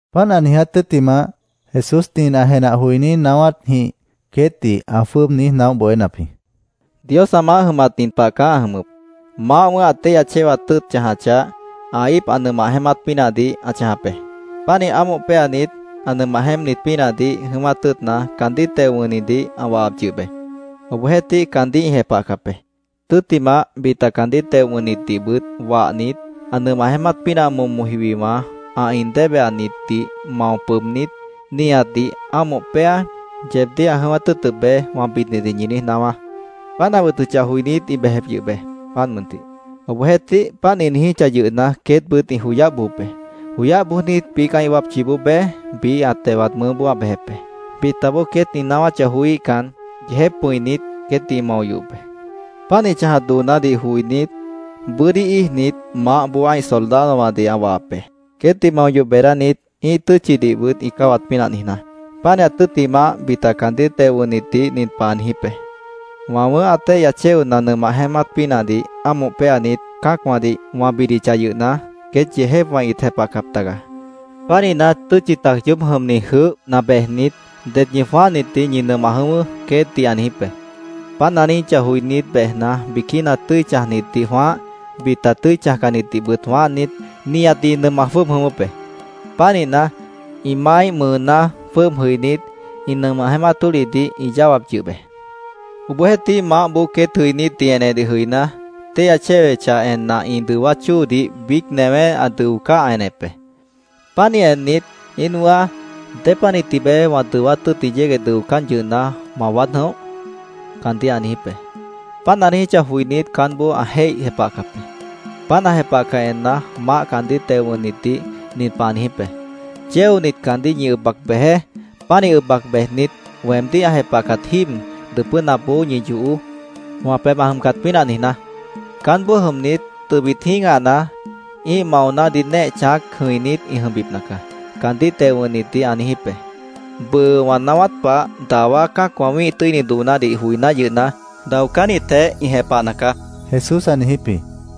Páant ã niiját tʉ́ttimah, Jesús nin ã jenah joiní naáwátjĩh queétdih ã jwʉ́ʉb niíj naóh bohénap jĩ: “Dios ã maáh jʉmat nin pah caá ã jʉmʉp: Maáh wʉ̃ʉ́h ã téihya chéwat tʉ́ʉt chãjachah, ã íip ã nʉmah jeémát pínahdih ã chãjap be. Pánih ámoh péanit, ã nʉmah jeémpnit pínahdih jʉ̃ʉ́wát tʉ́ʉtna, caandíh teo wʉ̃hnidih ã wahap yʉh be. Obohjeéhtih, caandíh ĩ jepahcap be. Tʉ́ttimah, bita caandíh teo wʉ̃hnitdihbʉt wahnit, ‘Ã nʉmah jeémát pínah momo jiwiwã, ã in débehanitdih mao pʉʉbnít, nihatdih ámoh péa, yeebdíh ã jʉ̃ʉ́wát tʉ́ʉtʉp be’, wã bidnitdih ñi niíj naáwá. Páant ã wʉtʉchah joinít, ĩ bejep yʉh be, páant mʉntih. Obohjeéhtih, páant ĩ niijíchah yʉhna, queétbʉt ĩ joyáh bojop be. Joyáh bojnit, biíc ã́ih wápchiboó bej, biíh ã tewat mʉʉ́boó ã bejep be. Bitaboó queét ĩ naáwáchah joííhcan, yeejép pʉ̃init, queétdih ĩ mao yohop be. Páant ĩ chãjat doonádih joinít, bʉ́dí íijnit, maáhboó ã́ih soldadowãdih ã wahap be, queétdih mao yoh beedánit, ĩ́ih tʉ́tchidihbʉt ĩ cáwat pínah niijná. Pánihat tʉ́ttimah, bita caandíh teo wʉ̃hnitdih nin pah ã niijíp be: ‘Wã wʉ̃ʉ́h ã téihya chéona nʉmah jeémát pínahdih ámoh péanit, cã́acwãdih wã bidichah yʉhna, queét yeejépwã ĩt jepahcap taga. Pánihna, tʉ́tchi tac yoób jʉmni jʉʉ́hna bejnit, det ñi jwãáhnitdih ñi nʉmah jʉ̃ʉ́wʉ́’, queétdih ã niijíp be. Páant ã niijíchah joinít, bejna, biquína tʉ́i chãjnitdih jwãáh, bita tʉ́i chãjcannitdihbʉt jwãáhnit, nihatdih ĩ nʉmah jwʉ́ʉb jʉ̃ʉ́wʉ́p be. Pánihna, ĩ maáíh mʉʉná jwʉ́ʉb jʉibínit, ã nʉmah jeémát tólihdih ĩ yáwap yʉh be. “Obohjeéhtih, maáhboó queét jʉinítdih enedih jʉiná, téihya chéwechah enna ĩ dʉwát chóodih biíc newé ã dʉocáh, ã enep be. Pánih ennit, ‘¿Íin wʉ̃ʉ́á, dépanih tibeé wã dʉwát tʉ́ʉtni yégueh dʉocán yʉhna, ma waád jʉ̃óh?’ caandíh ã niijíp be. Páant ã niijíchah joinít, caánboó ã jéih jepahcap be. Páant ã jepahcah enna, maáh caandíh teo wʉ̃hnitdih nin pah ã niijíp be: ‘Chéonit, caandíh ñi ʉb bac bejeé. Pánih ʉb bac bejnit, weemdíh ã jepahcat jíib, dʉpʉ́napboó ñi yohoó, wã pebh ã jʉmcat pínah niijná. Caánboó jʉmnit, tʉbit jĩ́gahna, ĩ́ih maonádih néeh chãác jʉ̃inít ĩ jʉmbipna caá’, caandíh teo wʉ̃hnitdih ã niijíp be. “Bʉʉ wã naáwát pah, dawá cã́acwã wĩ́ih tʉ́ini doonádih joiná yʉhna, daocánnitjeh ĩ jepahna caá”, Jesús ã niijíp jĩ.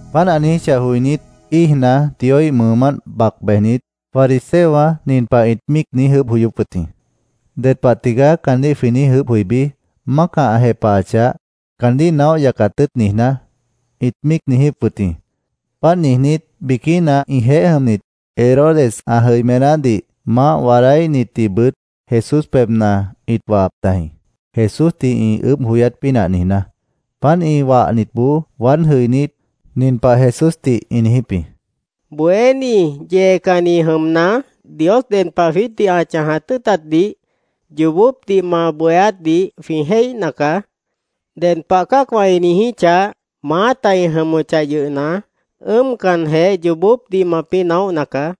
Páant ã niijíchah joinít, íijna, Dioíh mʉʉmánt bac bejnit, fariseowã nin pah ĩt míic niíj ʉʉ́bh joyóp wʉt jĩ: “¿Ded pah tigaá caandíh jwĩ niíj ʉʉ́bh joibí, mácah ã jepahachah, caandíh naóh yacat tʉ́ʉt niijná?” ĩt míic niijíp wʉt jĩ. Páant niijnít, biquína ĩjeéh jʉmnit, Herodes ã jʉimenádih maáh waadáíhnitdihbʉt Jesús pebhna ĩt wahap tajĩ, Jesúsdih ĩ ʉʉ́bh joyát pínah niijná. Páant ĩ wahnitboó waád jʉinít, nin pah Jesúsdih ĩ niijíp jĩ: —Bohéní, yeecanni jʉmna, Dios ded pah jwiítdih ã chãjat tʉ́ʉtatdih yoobópdih ma bohéátdih jwĩ jéihna caá. Ded pah cã́acwã ĩ niijíchah, maáta ĩ jʉmʉchah yʉhna, ʉ́ʉmcanjeh yoobópdih mapĩ́ naóhna caá.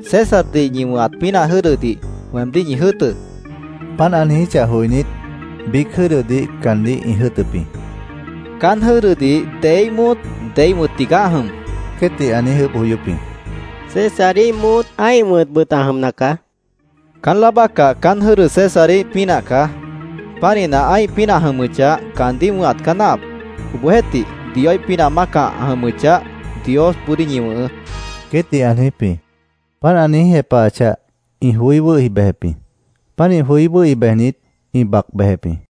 Césardih ñi wʉ̃hat pínah jʉ́dʉdih weemdíh ñi jʉ́ʉtʉ́, ã niijíp jĩ. Páant ã niijíchah joinít, biíc jʉ́dʉdih caandíh ĩ jʉ́ʉtʉp jĩ. —¿Caán jʉ́dʉdih deíh móot, deíh wʉ̃t tigaá ã jʉm? queétdih ã niíj ʉʉ́bh joyóp jĩ. —Césaríh móot, ã́ih wʉ̃tbʉt ã jʉmna caá, ĩ niíj jepahap jĩ. —Caán láa bácah caán jʉ́dʉ Césaríh pínah caá. Pánihna, ã́ih pínah ã jʉmʉchah, caandíh wʉ̃hat caá náahap. Obohjeéhtih, Dioíh pínah mácah ã jʉmʉchah, Diosboodíh ñi wʉ̃hʉʉ́, queétdih ã niijíp jĩ. Páant ã niíj jepahachah, ĩ joí wʉ́hi bejep jĩ. Pánih joí wʉ́hi bejnit, ĩ bac bejep jĩ.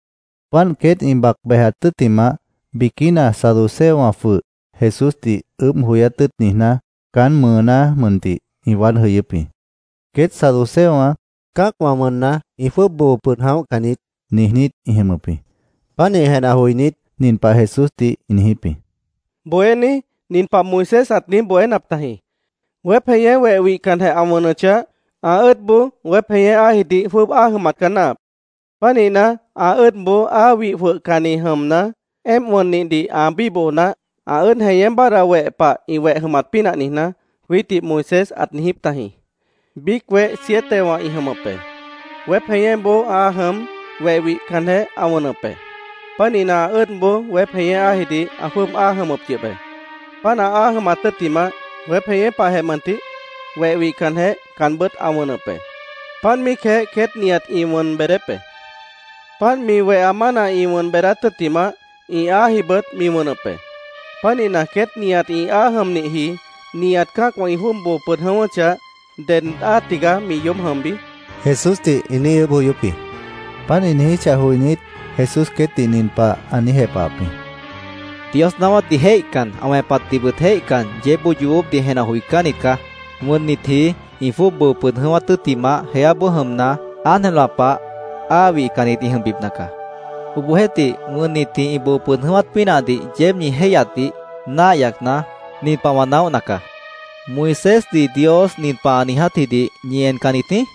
Páant queét ĩ bac bejat tʉ́ttimah, biquína saduceowã jwʉh, Jesúsdih ʉʉ́bh joyát tʉ́ʉt niijná, caán mʉʉná mʉntih ĩ waád jʉyʉ́p jĩ. Queét saduceowã “Cã́acwã wʉnna, ĩ jwʉ́ʉb boo pʉd jʉ̃óhcan niít”, niijnít ĩ jʉmʉp jĩ. Pánih jenah joinít, nin pah Jesúsdih ĩ niijíp jĩ: —Bohéní, nin pah Moisés ãt niíj bohénap tajĩ: ‘Weép jeñé weh wihcanjeh ã wʉnʉchah, ã ʉ́ʉdboó weép jeñé áajidih jwʉ́ʉb áa jʉmat caá náahap. Pánihna, ã ʉ́ʉdboó áa wih jwʉhcanni jʉmna, éemp wʉnnihdih ã bíboho naáh, ã ʉ́ʉd jeñé báadhda weh pah ĩ weh jʉmat pínah niijná’, jwiítdih Moisés ãt niijíp tajĩ. Biíc weh sietewã ĩ jʉmʉp be. Weép jeñéboó áa jʉm, weh wihcanjeh ã wʉnʉp be. Pánihna, ã ʉ́ʉdboó weép jeñé áajidih ã jwʉ́ʉb áa jʉmʉp yʉh be. Páant áa jʉmat tʉ́ttimah, weép jeñé pahjeh mʉntih, weh wihcanjeh caanbʉ́t ã wʉnʉp be. Páant míicjeh queét nihat ĩ bʉʉ́d beedép be. Páant mi weha mána ĩ wʉn beedát tʉ́ttimah, ĩ áajibʉt mi wʉnʉp be. Pánihna, queét nihat ĩ áa jʉmnihji, nihat cã́acwã ĩ jwʉ́ʉb boo pʉd jʉ̃ʉ́wʉ́chah, ¿ded áa tigaá mi yoób jʉmbi? Jesúsdih ĩ niíj ʉʉ́bh joyóp jĩ. Páant ĩ niijíchah joinít, Jesús queétdih nin pah ã niíj jepahap jĩ: —¡Dios naáwátdih jéihcan, ã wẽpatdihbʉt jéihcan, yeébboó yoobópdih jenah joicánnit caá! Wʉnnitji ĩ jwʉ́ʉb boo pʉd jʉ̃ʉ́wát tʉ́ttimah, jeáboó jʉmna, ángelwã pah áa wihcannit ĩ jʉmbipna caá. Obohjeéhtih, wʉnnitji ĩ boo pʉd jʉ̃ʉ́wát pínahdih yeéb ñi jéihyatdih náah yacna, nin pah wã naóhna caá. ¿Moisésdih Dios nin pah ã niijátjidih ñi encannit jĩí?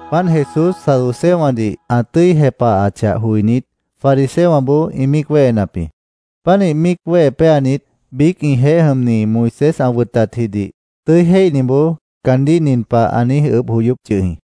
Páant Jesús saduceowãdih ã tʉ́i jepahachah joinít, fariseowãboó ĩ míic wéhenap jĩ. Pánih míic wéhe péanit, biíc ĩjeéh jʉmni, Moisés ã wʉtatjidih tʉ́i jéihniboó caandíh nin pah ã niíj ʉʉ́bh joyóp yʉh jĩ: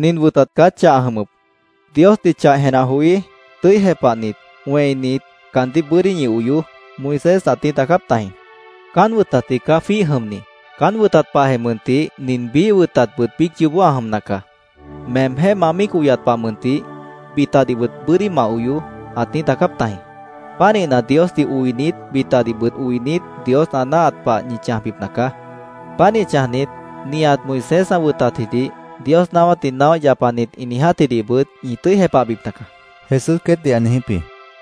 —Nin wʉtat caá chah ã jʉmʉp. ‘Diosdih chah jenah joí, tʉ́i jepahnit, wẽinit, caandíh bʉ́dí ñi oyoó’, Moisés ãt niíj daacáp tajĩ. Caán wʉtatji caá jwíih jʉmni. Caán wʉtat pahjeh mʉntih, nin biíh wʉtatbʉt biíc yoobó ã jʉmna caá: ‘Meemjéh ma míic oyat pah mʉntih, bitadihbʉt bʉ́dí ma oyoó’, ãt niíj daacáp tajĩ. Pánihna, Diosdih oinit, bitadihbʉt oinit, Dios ã náahat pah ñi chãjbipna caá. Pánih chãjnit, nihat Moisés ã wʉtatjidih, Dios naáwátdih naóh yapanit ĩ niijátjidihbʉt ñi tʉ́i jepahbipna caá, Jesús queétdih ã niijíp jĩ.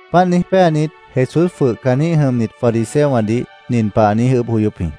Páant niíj péanit, Jesús jwʉh caanjĩ́h jʉmnit fariseowãdih nin pah ã niíj ʉʉ́bh joyóp jĩ: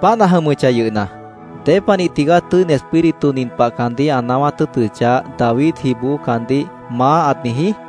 —Páant ã jʉmʉchah yʉhna, ¿Dépanih tigaá Tʉ́ini Espíritu nin pah caandíh ã naáwát tʉ́ʉtʉchah, Davidjiboó caandíh ‘Maá’, ãt niijí?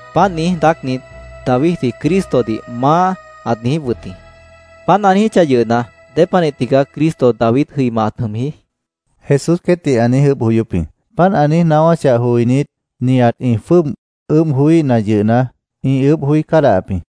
Páant niíj daácnit, Davidji Cristodih ‘Maá’, ãt niijíp wʉt jĩ. Páant ã niijíchah yʉhna, ¿dépanih tigaá Cristo David jʉima ãt jʉmji? Jesús queétdih ã niíj ʉʉ́bh joyóp jĩ. Páant ã niíj naáwáchah joinít, nihat ĩ jwʉ́ʉb ʉʉ́bh joííhna yʉhna, ĩ ʉʉ́bh joí cádahap jĩ.